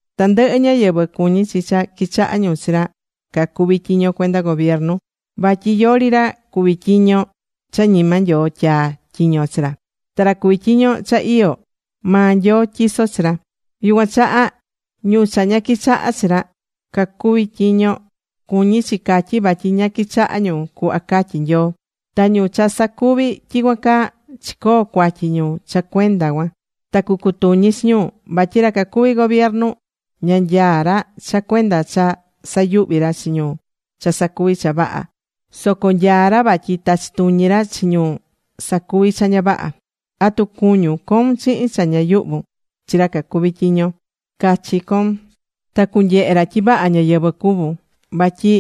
Tandɨhɨ ñáyɨvɨ cuñí chi cha qui̱chaha ñu chi ra cacuví tyiño cuenda gobiernu. Vatyi yori ra cuví tyiño cha ñima Nyoo tyaa̱ tyiño chi ra. Ta ra cuví tyiño cha iyó, maa Nyoo tyiso̱ chi ra. Yucuan chaha, ñu cha ña quichahá chi ra cacuví tyiño, cuñí chi catyi vatyi ña quichahá ñu cuhva catyi̱ Nyoo. Ta ñu cha sacuví tyicuan caa, chicoo̱ cuatyi ñu cha cuenda cuan, ta cucutuñi chi ñu. Vatyi ra cacuví gobiernu, ña nyaá ra cha cuenda cha sayuhví ra chi ñu cha sacuví cha vaha, soco nyaá ra vatyi tachi tuñi ra chi ñu sacuví cha ña vaha. ¿Atu cuñún coun chihin cha ña yuhvun chi ra cacuví tyiño? Ca̱chi coun, ta cunyehe ra tyi vaha ñáyɨvɨ cuvún. Vatyi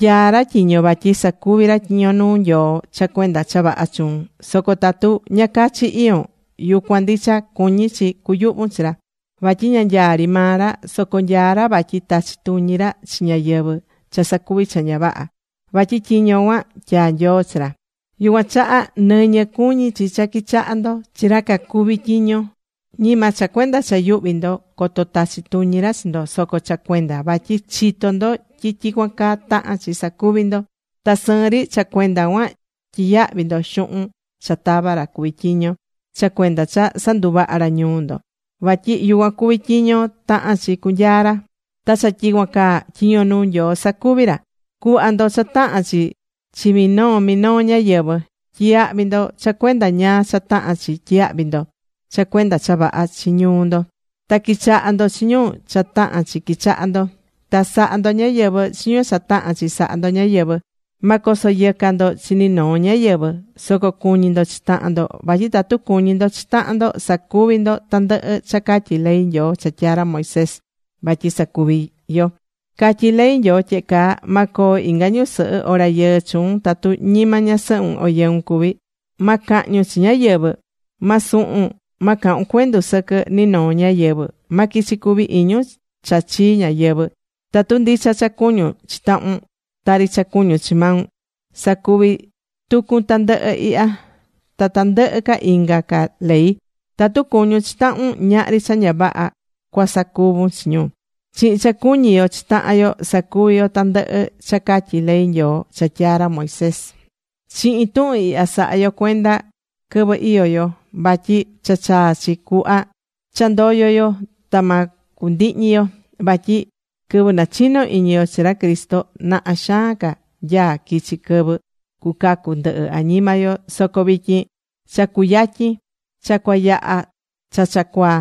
nyaá ra tyiño vatyi sacuví ra tyiño nuu Nyoo cha cuenda cha vaha chuun. Soco tatu ña cachi iyón, yucuan ndicha cuñí chi cuyuhvun chi ra. Vatyi ña nyaá ri maa ra, soco nyaá ra vatyi tachí tuñi ra chi ñáyɨvɨ cha sacuví cha ña vaha, vatyi tyiño cuan tyaa̱ Nyoo chi ra. Yucuan chaha nɨñɨ cuñí chi cha quichaha ndo chi ra cacuví tyiño, ñima cha cuenda cha yuhvi ndo coto tachi tuñi ra chi ndo, soco cha cuenda vatyi chitó ndo tyi tyicuan caa tahán chi sacuvi ndo. Ta sɨɨn ri cha cuenda cuan tyiyahví ndo xuhun cha tava ra cuví tyiño cha cuenda cha sanduvahá ra ñuu ndo. Vatyi yucuan cuví tyiño tahán chi cunyaa ra, ta cha tyicuan caa tyiño nuu Nyoo sacuví ra. Cu̱hva ndo cha tahán chi chi minoo minoo ñáyɨvɨ. Tyi̱yahvi ndo cha cuenda ñáá cha tahán chi tyiyahvi ndo cha cuenda cha vaha chi ñuu ndo. Ta qui̱chaha ndo chi ñu cha tahán chi quichaha ndo. Ta sa̱ha ndo ñáyɨvɨ chi ñu cha tahán chi saha ndo ñáyɨvɨ. Ma coso yɨca ndo chi ni noo ñáyɨvɨ. Soco cu̱ñi ndo chi tahan ndo, vatyi tatu cuñí ndo chi tahan ndo sacuví ndo tandɨhɨ cha catyí ley Nyoo cha tyaa̱ ra Moisés vatyi sacuvi yo. Catyí ley Nyoo tyehe caa: “Ma coo inga ñusɨhɨ o rayɨɨ chuun tatu ñima ñasɨhun o yɨun cuví. Ma cahñun chi ñáyɨvɨ. Ma suhun. Ma cahun cuendu sɨquɨ ni noo ñáyɨvɨ. Ma quichi cuvi iñun cha chii ñáyɨvɨ.” Tatu ndicha cha cuñún chi tahun, tari cha cuñún chi maun, sacuví tucun tandɨhɨ ihya ta tandɨhɨ ca inga ca ley. Tatu cuñún chi tahun, ñahri cha ña vaha cua sacuvun chi ñu. Chihin cha cuñí yo chi tahan yo, sacuví yo tandɨhɨ cha catyí ley Nyoo cha tyaa̱ ra Moisés. Chihin tuhun ihya sa̱ha yo cuenda quɨvɨ iyó yo. Vatyi cha chaa̱ chi cuhva cha ndoyo yo ta ma cundihñi yo. Vatyi quɨvɨ nachino iñi yo chi ra Cristo, naha xaan ca nyaá quichi quɨvɨ cucacu ndɨhɨ añima yo, soco vityin cha cuyatyin. Cha cua yaha cha cha cuaa.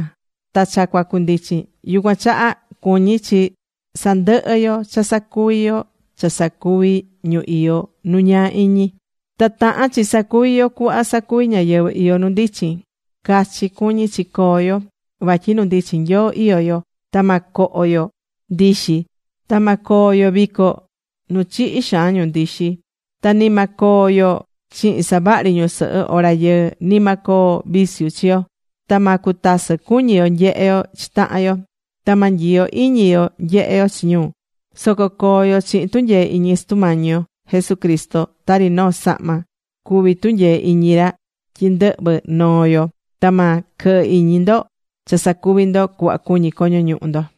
Ta cha cua cundichin. Yucuan chaha cuñí chi sandɨhɨ yo cha sacuvi yo cha sacuví ñu iyó nu ñaa iñi. Ta tahán chi sacuvi yo cuhva sacuví ñáyɨvɨ iyó nu ndichin. Cachi cuñí chi coo yo. Vatyi nu ndichin Nyoo iyó yo. Ta ma coho yo ndixi, ta ma coo yo vico nu chihi xaan ñu ndixi. Ta ni ma coo yo chihin savaha ri ñusɨhɨ o rayɨɨ. Ni ma coo viciu chi yo. Ta ma cutasɨ cuñi yo nyehe yo chi tahan yo. Ta ma nyiyo iñi yo nyehe yo chi ñu. Soco co̱o yo chihin tunyee iñi Sutu Mañi yo Jesucristo, tari noo sahma cuví tunyee iñi ra tyi ndɨhvɨ noo yo. Ta ma quɨhɨ iñi ndo cha sacuvi ndo cuhva cuñí coño ñuhu ndo.